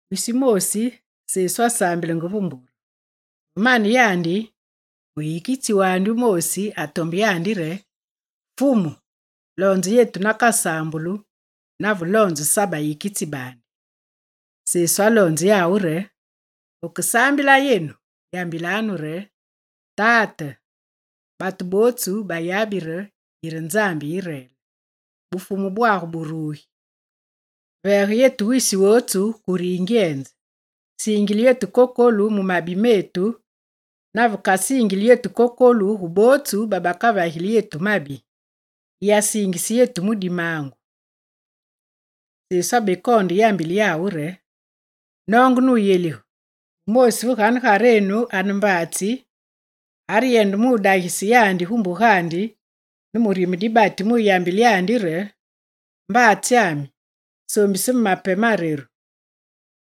Wisi wumoosi, Sesu asaambilenge ve ma mbure. Ve mane yandi, muyikitsi wandi wumoosi atombe yandi re: «Fumu, loonze yetu nakasaambulu, nave loonze Sa bayikitsi baandi.» Sesu aloonze yawu re: «Veke saambila yenu, yambilanu re: Tate, batu bootsu bayabi re yire Nzambi yi reel; Bufumu bwagu burugi. Veege yetu wisi wotsu kure yingyenze. Siingile yetu kokolu mu mabi metu, nave yetu dikasiingili kokolu gu bootsu babakavagili yetu mabi. Yiyasiingise yetu mu dimaangu.» Sesu abekoonde yambile yawu re: «Noonge nuyelige: wumoosi ve ganegarenu ane mbaatsi, areyende dagise yandi gu mbugandi ne murime dibati muyambile yandi re: “Mbaatsyami, soombise me mape mareru.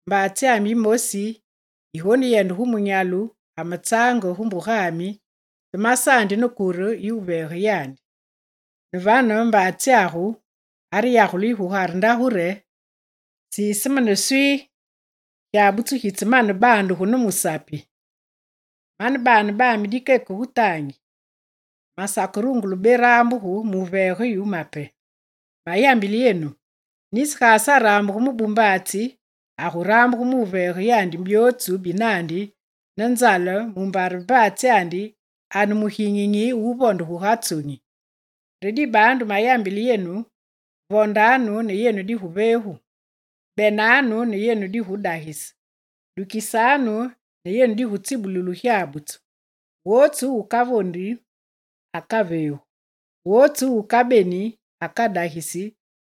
Mbaatsyami yimoosi yigoneyende gu munyalu amatsaange gu mbugami te masaandi ne kure yi wuveege yandi.” Ne vane mbaatsyagu areyagule yu gugare ndagu re: “Siise me ne swii! Gyabutsu gitsemane wubandugu ne musapi, mane baane bami dikeke gu taangi, masakerungule beraambuge muveege yu mape.” Mayambile yenu, nisi ga asaraambugu mu bumbaatsi, aguraambugu muveege yandi byootsu binandi ne nzale, mumbare mbaatsyandi ane muginyinyi wuvonde guga tsonyi. Re dibaandu, mayambile yenu: vondanu ne yenu diguveegu; benanu ne yenu digudagise; dukisanu ne yenu digutsibululu gyabutsu. Wotsu wukavondi akaveegu, wotsu wukabeni akadagisi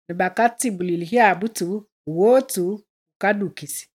ne bakatsibulili gyabutsu gu wotsu wukadukisi.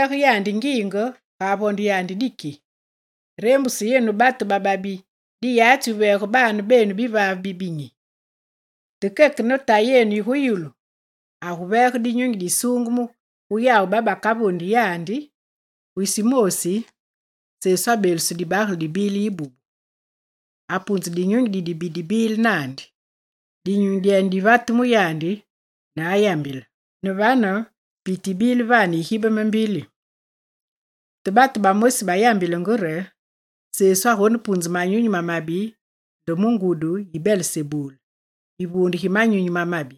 Vore aguveege yandi ngiinge ga avonde diki? Reembuse yenu batu bababi diyatsi wuveege baane benu bivaave bibinyi. Te keke ne Tayi yi gu yulu, aguveege Dinyunyi Disuungeme gu yawu babakavondi yandi!» Wisi wumoosi, Sesu abeeluse dibagele dibile yibubu. Apunze dinyunyi didibi dibile naandi. Dinyunyi dyene divate mu yandi ne ayambile. Ne vane piti yibile vane yigibeme mbili. Te batu bamosi bayambile re: «Sesu agonepunze manyunyi mamabi nde mu ngudi yi Belesebul, yivuunde gi manyunyi mamabi.»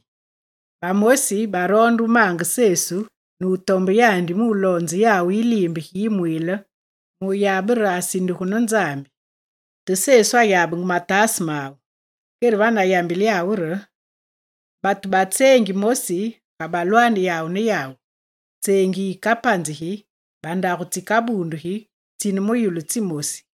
Bamosi baroonde wumaange Sesu ne batombe yandi muloonze yawu yiliimbe gi yimwiile muyabe re asindugu ne Nzambi. Te Sesu ayabenge mataase mawu. Kere vane ayambile yawu re: «Batu ba tseengi moosi ga balwane yawu ne yawu, tseengi yikapanzigi, bandagu tsikabundugi, tsine mu yulu tsimosi.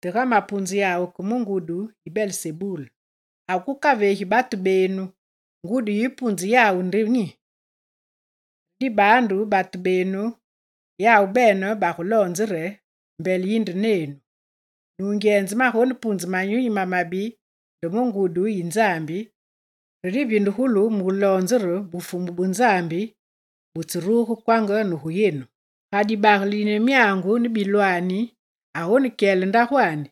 Te ga mapunze yawu ke mu ngudi yi Belesebul, ake wukaveegi batu benu ngudi yi wupunze yawu nde nyi? Re dibaandu batu benu yawu bene baguloonze re, mbele yinde nenu! Nungyenze magonepunze manyunyi mamabi nde ne ngudi yi Nzambi, re divindugulu muloonze re Bufumu bu Nzambi butseruge kwanga ne gu yenu. Ga dibagele dine myaangu ne bilwani agonekyele ndagwandi,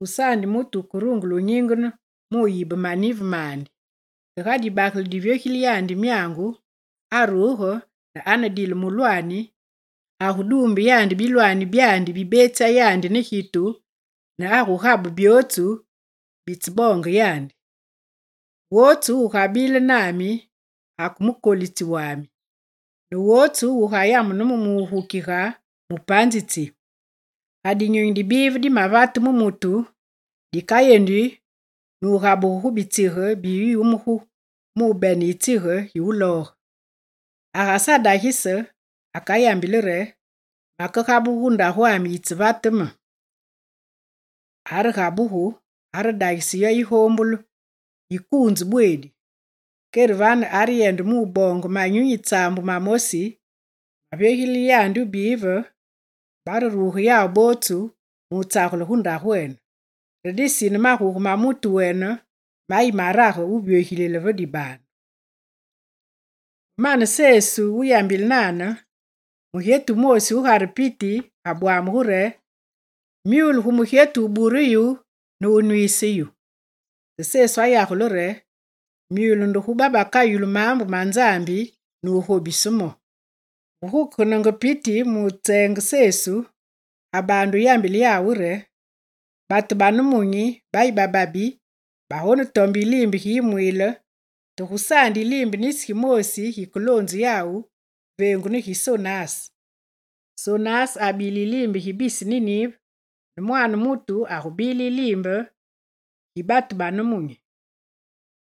gusaandi mutu wukerungule nyingene mu wuyibe manive mandi. Te ga dibagele divyogilile yandi myaangu aruge ne anedile mulwaani, aguduumbe yandi bilwani byandi bibetsya yandi ne gitu ne wugabe byootsu bitseboonge yandi. Wotsu wugabile nami ake mukolitsi wami, ne wotsu wugayamune me mugukige, mupanzitsi. Ga dinyunyi didibi dimavate mu mutu, dikayendi nugabugu gu bitsige bi yumugu mubene yitsige gi wulooge. Agasadagise, akayambili re: “Makegabuge gu ndagwami yitsevate me.” Aregabugu, aredagisi yo yigoombulu, yikuunzu bweedi. Kere vane areyende mu wuboonge manyunyi tsaambu mamosi mavyogilile yandi wubive, bareruge yawu bootsu mutsagele gu ndagwene. Re disine maguge ma mutu wene mayi marage wuvyogilile ve dibaandu.» Ve mane Sesu wuyambile nane, mugyetu wumoosi gugare piti abwamugu re: «Myule gu mugyetu wubure yu ne wunwiise yu.» Te Sesu ayagule re: «Myule nde gu babakayulu maambu ma Nzambi ne wugobise mo!» Ve gukegenenge piti nutseenge Sesu, abaande yambile yawu re: «Batu ba nemunyi bayi bababi, bagonetombe yiliimbe gi yimwiile, te gusaandi yiliimbe nisi gimoosi gikeloonzu yawu, veengu ne gi Sonas. Sonas abile yiliimbe gi bisi Ninive ne Mwaane mutu agubile ne yandi yiliimbe gi batu ba nemunyi.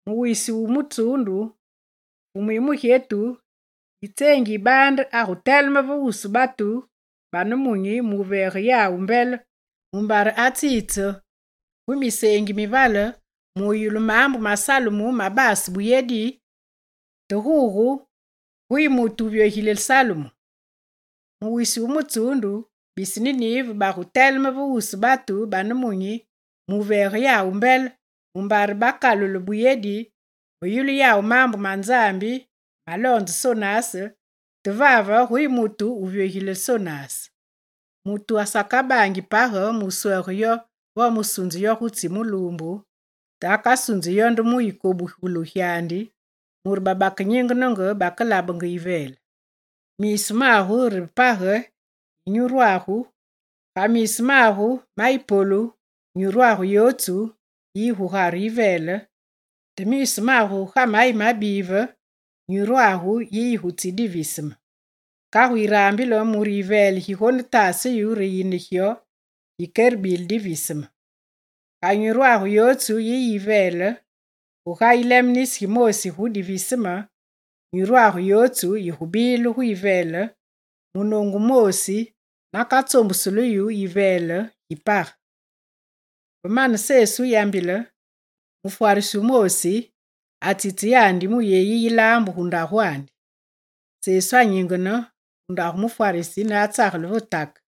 Mu wisi wu mutsuundu, fumu yi mugyetu yi tseengi yi baande aguteleme ve wusu batu ba nemunyi muveege yawu mbele, mumbare atsiitse gu miseengi mivale muyulu maambu ma Salumu mabase buyedi, te gugu guyi mutu wuvyogilile Salumu! Mu wisi wu mutsuundu, bisi Ninive baguteleme ve wusu batu ba nemunyi muveege yawu mbele, mumbare bakalule buyedi ve yulu yawu maambu ma Nzambi maloonze Sonas, te vave guyi mutu wuvyogilile Sonas! Mutu asakabaangi page muswege yo vo musunze yo gutsi muluumbu, te akasunzi yo nde ve yikobugulu gyandi, mure babakenyingenenge bakelabenge yiveele. Miisu magu re page yi nyurwagu, ga miisu magu mayi polu, nyurwagu yotsu yiyi gugare yiveele te miisu magu ga mayi mabive, nyurwagu yiyi gutsi diviseme. Kagu yirambile mure yiveele gigonetaase yu re yine gyo gikerebile diviseme. Ga nyurwagu yotsu yiyi gu yiveele, guga yileme nisi gimoosi gu diviseme, nyuru yotsu yigubile gu yiveele munoongu wumoosi naka tsoombusu yu ne yiveele gi page.» Ve mane Sesu wuyambile, mufwarisi wumoosi atsitse yandi mu yeyi yilaambu gu ndagwandi. Sesu anyingene gu ndagu mufwarisi ne atsagele ve take.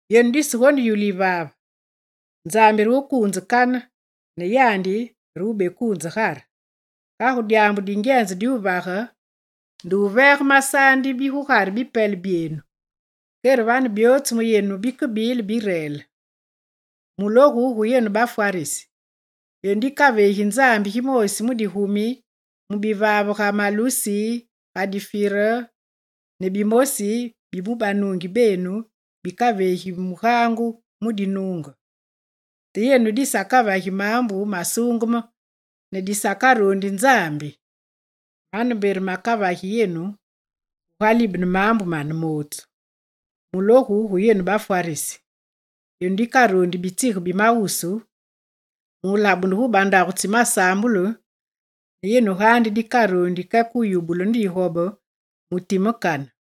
Yenu disegoneyulu yivaave! Nzambi re wukuunze kane, ne yandi re wubekuunze Gugare. Kagu dyaambu dingyenze diwuvage nde wuveege masaandi bi gugare bipele byenu, kere vane byootsu mu yenu bikebile bireele. Mulogu gu yenu bafwarisi! Yenu dikaveegi Nzambi gimoosi mu digumi mu bivaave ga na malusi, ga difire, ne bimosi bi mu banuungi benu bikaveegi mugaangu mu dinuunge. Te yenu disakavagi maambu masuungeme ne disakaroondi Nzambi. Mane mbe re makavagi yenu gugalibene maambu mane mootsu. Mulogu gu yenu bafwarisi! Yenu dikaroondi bitsige bimawusu mulabunu gu bandagu tsi masaambulu ne yenu gaandi dikaroondi keke wuyubulu ne digobe mu timekane.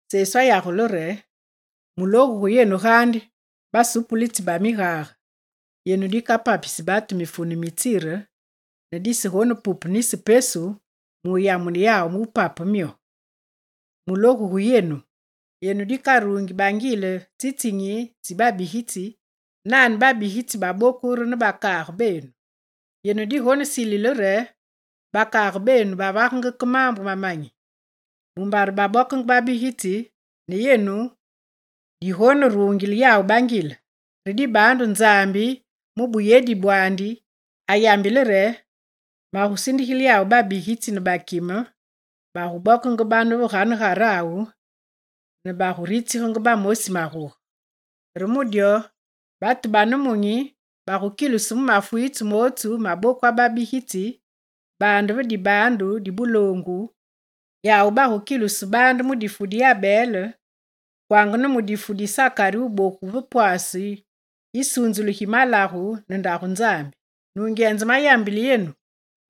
Sesu ayagule re: «Mulogu ne gu yenu gaandi basupulitsi ba migage! Yenu dikapapisi batu mifune mi tsire ne disegonepupe nisi pesu mu yamune yawu wupape myo. Mulogu gu yenu! Yenu dikaruungi bangile tsitsinyi tsi babigitsi, nane babigitsi baboku re ne bakaage benu. Yenu digonesilile re bakaage benu bavagenge ke maambu mamanyi, mumbare babokenge babigitsi, ne yenu digoneruunge bangile bawu! Re dibaandu Nzambi mu buyedi bwandi, ayambile re: “Magusindigile yawu babigitsi ne bakime; baguboke bane ve ganegarawu ne baguritsige bamosi maguge.” Re mu dyo batu ba nemunyi bagukilusu mu mafwiitse mootsu mabokwa babigitsi, baande ve dibaandu di buloongu, yawu bagukilusu baande mu difu di Abel, kwanga ne mu di Sakari wuboku ve pwase yisunzulu gi malagu ne Ndagu Nzambi. Nungyenze mayambile yenu,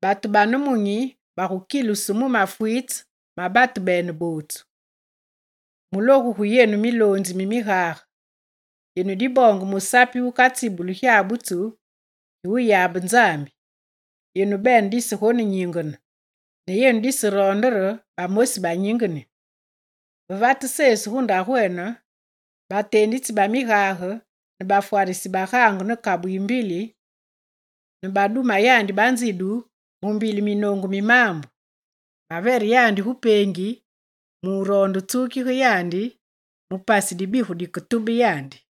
batu ba nemunyi bagukilusu mu mafwiitse ma batu bene bootsu. Mulogu gu yenu, miloonzi mi migage. Yenu diboonge musapi wukatsibulu gyabutsu gi wuyabe Nzambi: yenu bene disegonenyingene, ne yenu diseroonde re bamosi banyingeni.» Ve vate Sesu gu ndagwene, bateenditsi ba migage ne bafwarisi bagaangu ne kabu yi mbili ne baduma yandi banzidu mu mbili minoongu mi maambu. Bavere yandi gu peengi muroonde wutsukige yandi mu pasi dibigu diketube yandi.